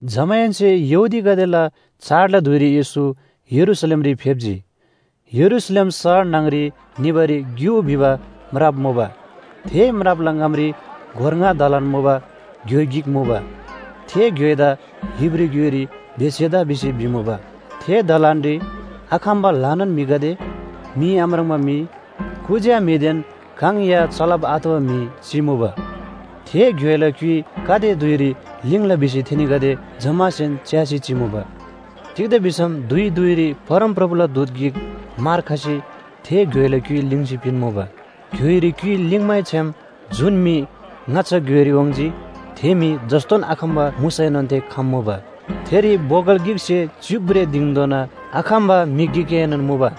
जमाहेन्‍से यहूदीगदेला चाडला धुइरी येशू यरूशलेमरी फेप्‍जी। यरूशलेम शहर न्‍हङ‍री निबारी ग्‍यु भिबा म्राप मुबा। थे म्रापला ङामरी गोर ङा दलान मुबा घ्‍योइ गिक मुबा। थे घ्‍योइदा हिब्रू ग्‍योइरी बेथेसदा भिसी भिमुबा। थे दलानरी आखम्‍बा ल्‍हानान म्‍हिगदे, मी आम्राङ्बा म्‍हि, कुज्‍या म्‍हिदेन काङ या चलब आतबा म्‍हि चिमुबा। थे घ्‍योइला क्‍युइ गाते धुइरी ल्‍हिङ्‍ला भिसी थेनीगदे जम्‍मासेन च्‍यासी चिमुबा। तिग्‍दा भिसम धुइ धुइरी परमप्रभुला दूत गिक मार खसी थे घ्‍योइला क्‍युइ ल्‍हिङ्सी पिन्‍मुबा। घ्‍योइरी क्‍युइ ल्‍हिङ्मैछ्‍याम जुन म्‍हि ङाच्‍छा घ्‍योइरी वाङ्‌जी थे म्‍हि जस्‍तोन आखम्‍बा मुसैनोन थे खम्‍मुबा। थेरी बोगल गिकसे च्‍युक भ्रेः दिङधोना आखम्‍बा म्‍हि गिकएनोन मुबा।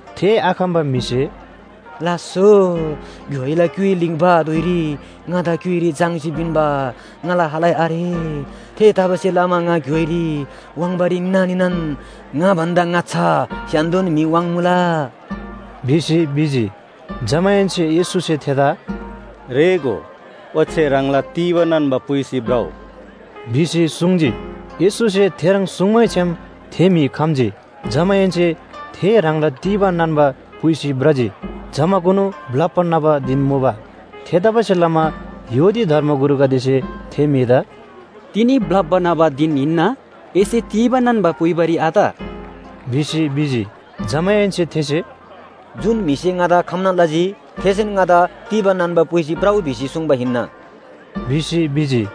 थे आखम्‍बा म्‍हिसे, “लास्‍सो, घ्‍योइला क्‍युइ ल्‍हिङ्बा धुइरी ङादा घ्‍योइरी झाङ्‌सी पिन्‍बा ङाला खालै आरे। थेतबासेलमा ङा घ्‍योइरी वाङ्बारी निना निनान ङा भन्‍दा ङाच्‍छा स्‍य्‍हान्‍दो म्‍हि वाङ्मुला” भिसी भिजी। जमाहेन्‍से येशूसे थेदा “रेःगो, ओच्‍छे ह्राङला तीबा नान्‍बा पुइसी भ्रउ” भिसी सुङ्जी। येशूसे थेह्रङ् सुङ्मैछ्‌याम थे म्‍हि खम्‍जी। जमाहेन्‍से थे ह्राङला तीबा नान्‍बा पुइसी भ्रजी। जमाकुनु ब्‍लप्‍बा न्‍हबा धिन मुबा। थेतबासेलमा यहूदी धर्मगुरुगदेसे थे म्‍हिदा “तिनी ब्‍लप्‍बा न्‍हबा धिन हिन्‍ना, एसे तीबा नान्‍बा पुइबारी आत” भिसी भिजी। जमाहेन्‍से थेसे “जुन म्‍हिसे ङादा खम्‍ना लजी थेसेन ङादा तीबा नान्‍बा पुइसी भ्रउ भिसी सुङ्बा हिन्‍ना” भिसी भिजी।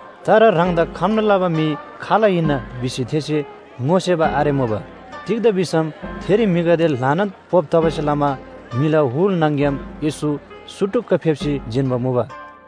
तर ह्राङदा खम्‍ना लबा म्‍हि खाल हिन्‍ना भिसी थेसे ङोसेबा आरेमुबा। तिग्‍दा भिसम थेरी म्‍हिगदे ल्‍हानान पोप तबासे लमा म्‍हिला हुल न्‍हङ‍ग्‍याम येशू सुटुक्‍क फेप्‍सी जिन्‍बा मुबा।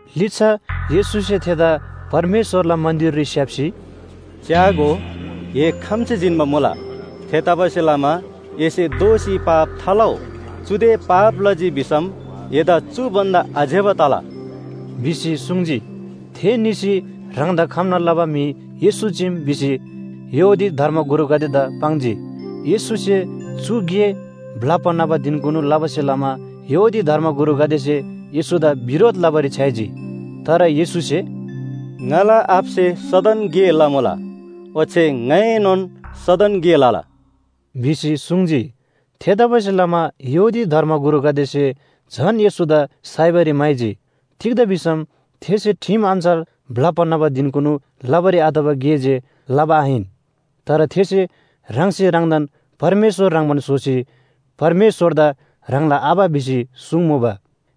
लिच्‍छा येशूसे थेदा परमेश्‍वरला मन्‍दिररी स्‍याप्‍सी, “च्‍यागो, ए खम्‍सी जिन्‍बा मुला। थेतबासेलमा एसे दोःसी पाप थालउ, चुदे पाप लजी भिसम एदा चु भन्‍दा आज्‍यबा तला” भिसी सुङ्जी। थे निसी ह्राङदा खम्‍ना लबा म्‍हि येशू चीम भिसी यहूदी धर्मगुरुगदेदा पाङ्जी। येशूसे चु गे ब्‍लप्‍बा न्‍हबा धिनकुनु लबासे लमा यहूदी धर्मगुरुगदेसे येशूदा बिरोध लबारी छ्‌याइजी। तर येशूसे “ङाला आबासे सदन गे लमुला। ओच्‍छे ङाइनोन सदन गे लला” भिसी सुङ्जी। थेतबासेलमा यहूदी धर्मगुरुगदेसे झन येशूदा साइबारी म्‍हाइजी, तिग्‍दा भिसम थेसे ठिम अन्‍छार ब्‍लप्‍बा न्‍हबा धिनकुनु लबारी आतबा गे जे लबा आहिन, तर थेसे ह्राङसे ह्राङदान परमेश्‍वर ह्रङ्‌बान स्‍होसी परमेश्‍वरदा ह्राङला आबा भिसी सुङ्मुबा।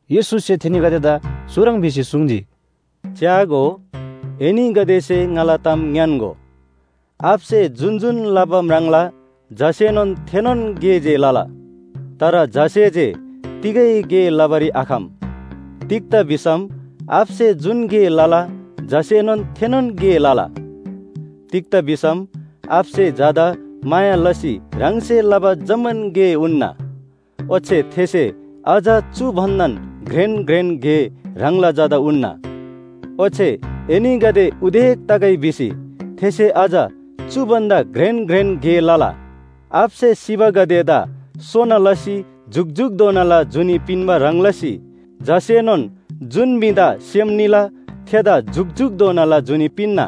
येशूसे थेनीगदेदा चुह्रङ् भिसी सुङ्जी, “च्‍यागो, एनीगदेसे ङाला ताम ङ्‌यान्‍गो, आबासे जुन जुन लबा म्राङ्ला झासेनोन थेनोन गे जे लला, तर झासे जे तिगै गे लबारी आखम। तिग्‍दा भिसम आबासे जुन गे लला झासेनोन थेनोन गे लला। तिग्‍दा भिसम आबासे झादा माया लसी ह्राङसे लबा जम्‍मान गे उन्‍ना। ओच्‍छे थेसे अझ चु भन्‍दान घ्रेन घ्रेन गे ह्राङला झादा उन्‍ना। ओच्‍छे एनीगदे उदेक तगै भिसी थेसे अझ चु भन्‍दा घ्रेन घ्रेन गे लला। आबासे सिबागदेदा सोना लसी जुकजुकधोनाला जुनी पिन्‍बा ह्रङ् लसी झासेनोन जुन म्‍हिदा सेम निला थेदा जुकजुकधोनाला जुनी पिन्‍ना।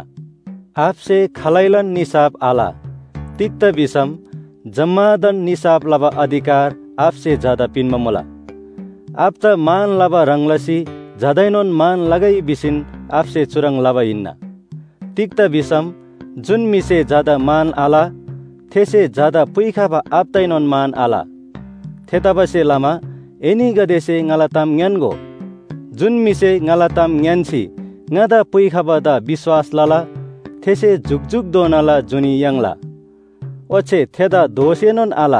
आबासे खालैलान निसाफ आल। तिग्‍दा भिसम जम्‍मादान निसाफ लबा अधिकार आबासे झादा पिन्‍बा मुला। आबादा मान लबा ह्रङ् लसी झादाएनोन मान लगै भिसीन आबासे चुह्रङ् लबा हिन्‍ना। तिग्‍दा भिसम जुन म्‍हिसे झादा मान आल थेसे झादा पुइखबा आबादाएनोन मान आल। “थेतबासेलमा एनीगदेसे ङाला ताम ङ्‌यान्‍गो, जुन म्‍हिसे ङाला ताम ङ्‌यान्‍सी ङादा पुइखबादा विश्‍वास लला थेसे जुकजुकधोनाला जुनी याङ्ला। ओच्‍छे थेदा दोषएनोन आल,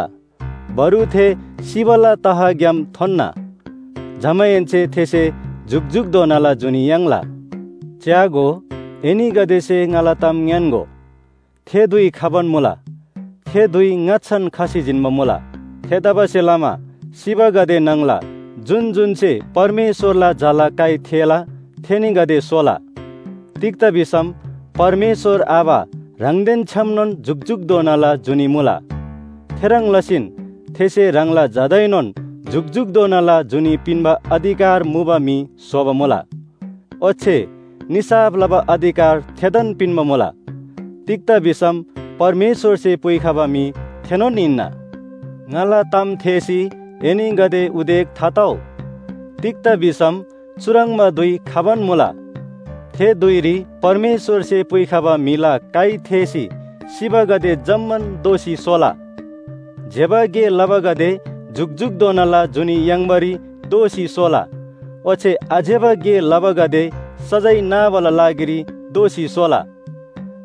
बरु थे सिबाला तहग्‍याम थोन्‍ना। जमाहेन्‍से थेसे जुकजुकधोनाला जुनी याङ्ला। च्‍यागो, एनीगदेसे ङाला ताम ङ्‌यान्‍गो, थे धुइ खबान मुला, थे धुइ ङाच्‍छान खसी जिन्‍बा मुला। थेतबासेलमा सिबागदे न्‍हङला जुन जुन्‍से परमेश्‍वरला झाला काइ थेःला थेनीगदे सोला। तिग्‍दा भिसम परमेश्‍वर आबा ह्राङदेन छ्‌यामनोन जुकजुकधोनाला जुनी मुला, थेह्रङ् लसीन थेसे ह्राङला झादाएनोन जुकजुकधोनाला जुनी पिन्‍बा अधिकार मुबा म्‍हि स्‍होबा मुला। ओच्‍छे निसाफ लबा अधिकार थेदान पिन्‍बा मुला। तिग्‍दा भिसम परमेश्‍वरसे पुइखबा म्‍हि थेनोन हिन्‍ना। “ङाला ताम थेःसी एनीगदे उदेक थातउ। तिग्‍दा भिसम चुह्रङ्बा धुइ खबान मुला, थे धुइरी परमेश्‍वरसे पुइखबा म्‍हिला काइ थेःसी सिबागदे जम्‍मान दोःसी सोला। ज्‍यबा गे लबागदे जुकजुकधोनाला जुनी याङ्बारी दोःसी सोला ओच्‍छे आज्‍यबा गे लबागदे सजाय नाबाला लागिरी दोःसी सोला।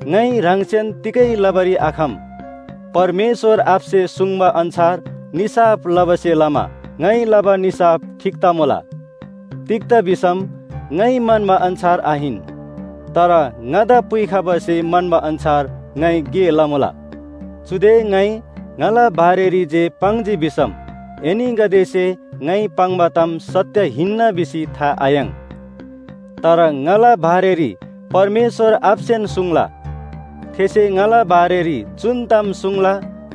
“ङाइ ह्राङसेन तिगै लबारी आखम, परमेश्‍वर आबासे सुङ्बा अन्‍छार निसाफ लबासे लमा ङाइ लबा निसाफ ठीक तमुला। तिग्‍दा भिसम ङाइ म्‍हन्‍बा अन्‍छार आहिन, तर ङादा पुइखबासे म्‍हन्‍बा अन्‍छार ङाइ गे लमुला। “चुदे ङाइ ङाला बारेरी जे पाङ्जी भिसम एनीगदेसे ङाइ पाङ्बा ताम सत्‍य हिन्‍ना भिसी था आयाङ्। तर ङाला बारेरी परमेश्‍वर आबासेन सुङ्ला, थेसे ङाला बारेरी जुन ताम सुङ्ला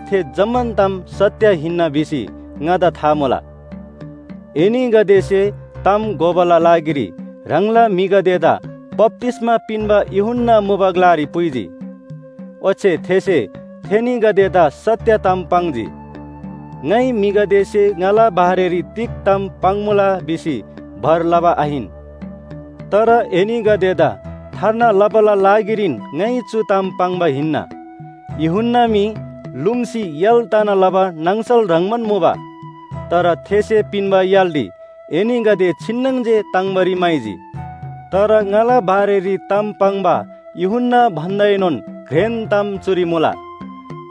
थे जम्‍मान ताम सत्‍य हिन्‍ना भिसी ङादा था मुला। “एनीगदेसे ताम घोबाला लागिरी ह्राङला म्‍हिगदेदा बप्‍तिस्‍मा पिन्‍बा यूहन्‍ना मुबा ग्‍लारी पुइजी। ओच्‍छे थेसे थेनीगदेदा सत्‍य ताम पाङ्जी। ङाइ म्‍हिगदेसे ङाला बारेरी तिग ताम पाङ्‌मुला भिसी भर लबा आहिन, तर एनीगदेदा थार्ना लबाला लागिरीन ङाइ चु ताम पाङ्बा हिन्‍ना। यूहन्‍ना मी लुङ्सी य्‍हाल तना लबा नाङसल ह्रङ्‌बान मुबा, तर थेसे पिन्‍बा य्‍हालरी एनीगदे छिन्‍नङ जे ताङ्बारी म्‍हाइजी। “तर ङाला बारेरी ताम पाङ्बा यूहन्‍ना भन्‍दाएनोन घ्रेन ताम चुरी मुला।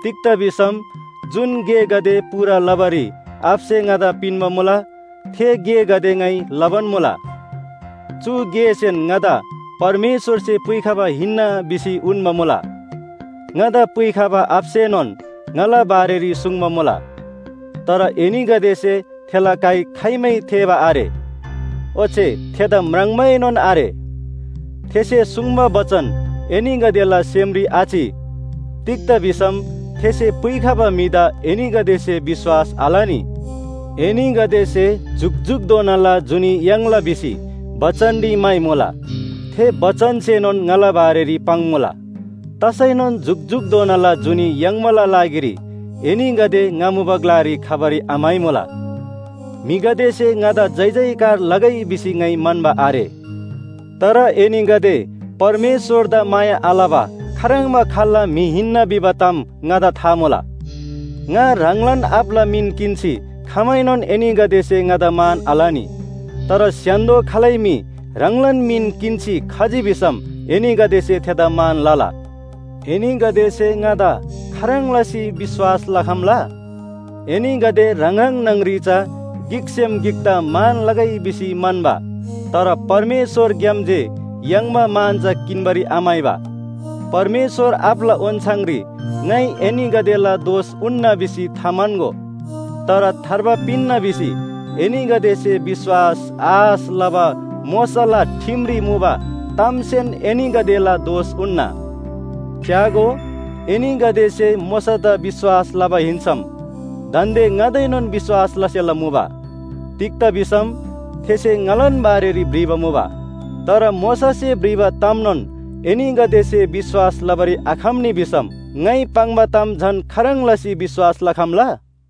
तिग्‍दा भिसम जुन गेगदे पूरा लबारी आबासे ङादा पिन्‍बा मुला, थे गेगदे ङाइ लबान मुला। चु गेसेन ङादा परमेश्‍वरसे पुइखबा हिन्‍ना भिसी उन्‍बा मुला। ङादा पुइखबा आबासेनोन ङाला बारेरी सुङ्बा मुला। तर एनीगदेसे थेला काइ खाइमै थेःबा आरे, ओच्‍छे थेदा म्राङ्बाएनोन आरे। थेसे सुङ्बा बचन एनीगदेला सेमरी आचि। तिग्‍दा भिसम थेसे पुइखबा म्‍हिदा एनीगदेसे विश्‍वास आलनी। एनीगदेसे जुकजुकधोनाला जुनी याङ्ला भिसी बचनरी म्‍हाइमुला, थे बचनसेनोन ङाला बारेरी पाङ्‌मुला। तसैनोन जुकजुकधोनाला जुनी याङ्बाला लागिरी एनीगदे ङा मुबा ग्‍लारी खबारी आम्‍हाइमुला। “म्‍हिगदेसे ङादा जयजयकार लगै भिसी ङाइ म्‍हन्‍बा आरे। तर एनीगदे परमेश्‍वरदा माया आलबा खाह्रङ्बा खाल्‍ला म्‍हि हिन्‍ना भिबा ताम ङादा था मुला। ङा ह्राङलान आबाला मिन किन्‍सी खमाएनोन एनीगदेसे ङादा मान आलनी। तर स्‍य्‍हान्‍दो खालै म्‍हि ह्राङलान मिन किन्‍सी खजी भिसम एनीगदेसे थेदा मान लला। एनीगदेसे ङादा खाह्रङ् लसी विश्‍वास लखम्‍ला? एनीगदे ह्राङ ह्राङ न्‍हङ‍री चा गिकसेम गिकदा मान लगै भिसी म्‍हन्‍बा, तर परमेश्‍वरग्‍याम जे याङ्बा मान चा किन्‍बारी आम्‍हाइबा। “परमेश्‍वर आबाला ओन्‍छाङरी ङाइ एनीगदेला दोष उन्‍ना भिसी थाम्‍हन्‍गो। तर थार्बा पिन्‍ना भिसी एनीगदेसे विश्‍वास आश लबा मोशाला ठिमरी मुबा तामसेन एनीगदेला दोष उन्‍ना। च्‍यागो, एनीगदेसे मोशादा विश्‍वास लबा हिन्‍सम दान्‍दे ङादाएनोन विश्‍वास लसेला मुबा। तिग्‍दा भिसम थेसे ङालान बारेरी भ्रिबा मुबा! तर मोशासे भ्रिबा तामनोन एनीगदेसे विश्‍वास लबारी आखम्‍नी भिसम ङाइ पाङ्बा ताम झन खाह्रङ् लसी विश्‍वास लखम्‍ला?”